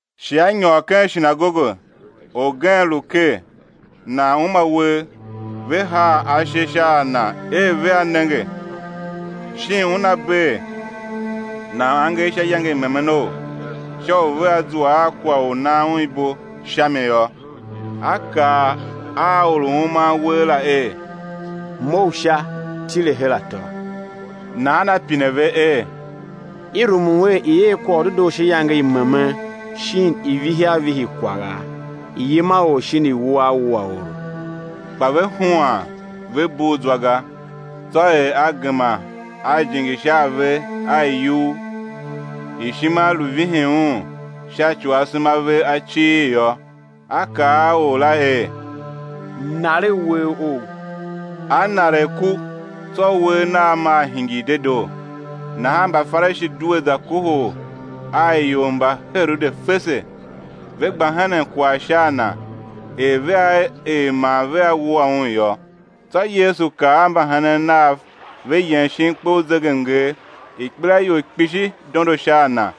Shi A nyôr ken shinagoge; orgen lu ker, nan uma uwegh. Ve haa ashe sha a Na er vea nenge shin Una bee nan angev sha iyange i memenou, sha u vea zua a kwagh u nan Un ibo sha mi yô. A kaa a or U uman uwegh la er: Mough sha, tile her atô. Nahan A pine ve er: I rumun er i̱ er kwagh u dedoo sha iyange i memen, shin i̱ vihi a vihi kwagha, i̱ yima or shin i̱ wua a wua oro? Kpa ve huan, ve bugh zwa ga. Tsô er A gema A jinge sha a ve a iyugh, ishima lu vihin Un sha ci u asema a ve a cighir yô, A kaa a or la er: Naregh uwegh ough; a naregh ku; tsô uwegh nagh maa hingir dedoo. Nahan Mbafarishi due za kohol a ior mba Herode fese, ve gba henen kwagh sha a Na, er vea er man vea wua Un yô. Tsô Yesu kar a mbahenen Nav, ve yem shin kpe u zegemnger. Ikpelaior kpishi dondo sha a Na,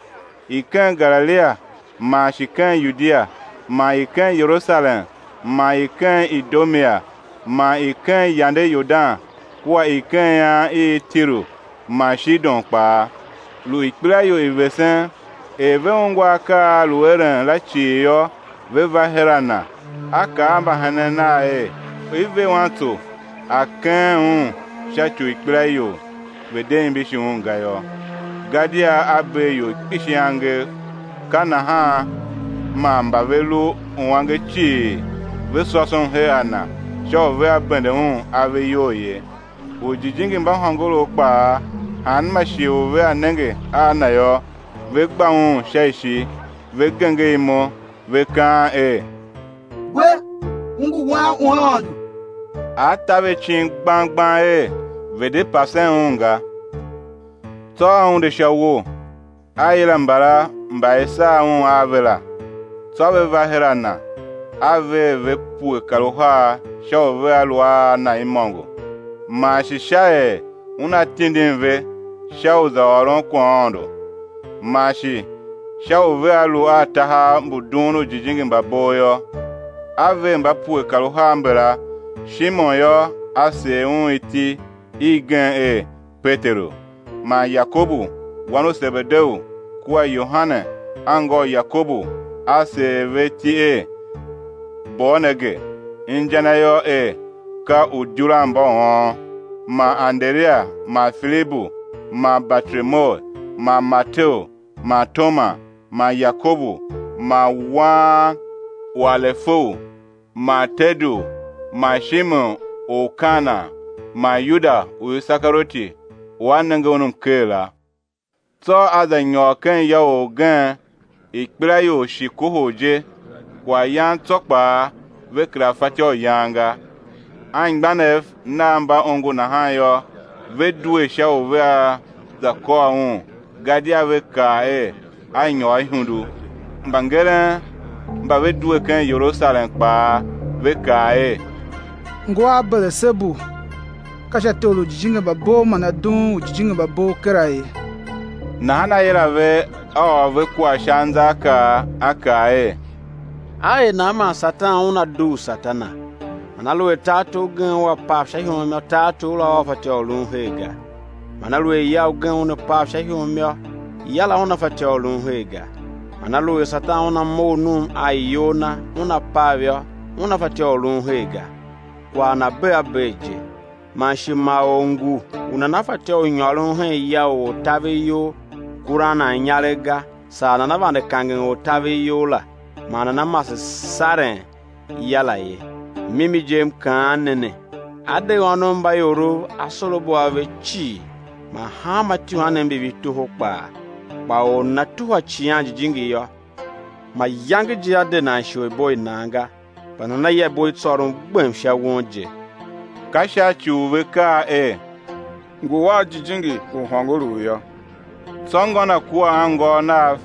i ken Galilia, man shi ken Yudia, man i ken Yerusalem, man i ken Idumea, man i ken yande Yordan kua i ken ian i Tiru man Shidon kpaa, lu ikpelaior i vesen; er ve ungwa akaa a A lu eren la cii yô, ve va her a Na. A kaa a mbahenen Nav er, i̱ ver wantso a keghen Un sha ci u ikpelaior ve̱ de imbishi Un ga yô. Gadia A bee ior kpishi angev, ka nahan man mba ve lu uange cii ve sôsom her a Na sha u vea bende Un ave iyol ye. Ujijingi mba hôngorough kpaa, hanma shighe u vea nenge a Na yô, ve gba Un sha ishi, ve genger imo ve kaan er: We, U ngu Wan u Aôndo. A ta ve icin gbang gbang er, ve̱ de pasen Un ga. Tsô A unde sha uwo, A yila mbala mba i sar Un a ve la, tsô ve va her a Na. A ver ve pue kar uhar sha u vea lu a Na imôngo, man shi sha er Una tindin ve sha u za ôron kwaghaôndo, man shi sha u vea lu a tahav mbu dughun ujijingi mba bov yô. A ver mba pue kar uhar mbala: Shimon yô, a seer un iti igen er Peteru; man Yakobu wan u Sebedeu kua Yohane anngô u Yakobu, A seer ve iti er Boanerge, inja na yô er, ka uidyuranmbauôn. Man Anderia man Filibu man Bartolomeu, man Mateu man Toma, man Yakobu wan u Alefeu, man Tadeu man Shimon or u Kana, man Yuda u Isekarioti, u a nenge Un mker la. Tsô A za nyôr hen ya ugen; ikpelaior shi kohol je, kwaghyan tsô kpaa, ve kera fatyô u yan ga. Anmgbianev Nav mba ongo nahan yô, ve due sha u vea za kôr Un, gadia ve kaa er, A nyôr ihundu. Mbangeren mba ve due ken Yerusalem kpaa, ve kaa er, ngu a Belesebu; ka sha tor u ujijingi mba bov man A dughun ujijingi mba bov kera ye. Nahan A yila ve, A ôr ve kwagh sha anzaakaa, A kaa er: A er nan man Satan una dugh Satana? Man aluer tartor ugen ua pav sha ihom yô, tartor la ua fatyô u lun her ga. Man aluer ya ugen una pav sha ihom yô, ya la una fatyô u lun her ga. Man aluer Satan una mough num a iyol na, una pav yô, una fatyô u lun her ga, kwagh na bee a bee je. Man shi ma or ngu u nana fatyô u nyôron hen ya u ortaveryol kuran nan inyaregh ga saa nana vande kangen ortaveryol la, man nana mase saren ya la ye. Mimi je M kaan ne ne, á de ônov mba iorov asorabo a ve cii man hanma ityuhwanev mbi ve toho kpaa; kpa or u nana tuhwa Icighan Jijingi yô, mayange je á de nan isholibo i nan ga, kpa nana ya ibo i tsôron gbem sha won je. Ka sha ci u ve kaa er: Ngu a jijingi u hôngorough yô. Tsô ngô Na kua anngôôv Nav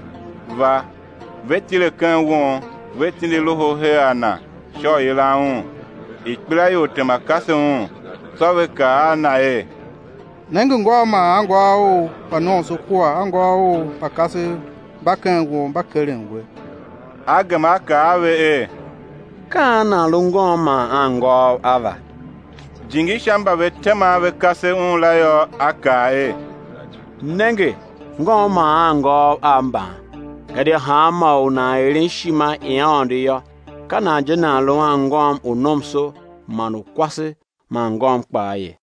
va, ve tile ken won, ve tindi loho her a Na sha u yilan Un. Ikpelaior tema, kase Un; tsô ve kaa a Na er: Nenge ngôu man anngôôv Ou mba kasev mba ken won, mba keren We. A gema A kaa a ve er: Ka an nan lu ngôm man anngôôv Ava? Jingi sha mba ve tema ve kase Un la yô, A kaa er: Nenge, ngôm, man anngôôv Av mban. Gadia hanma or u nan eren ishima i Aôndo yô, ka nan je nan lu anngôm u nomso man u kwase man ngôm kpaa ye.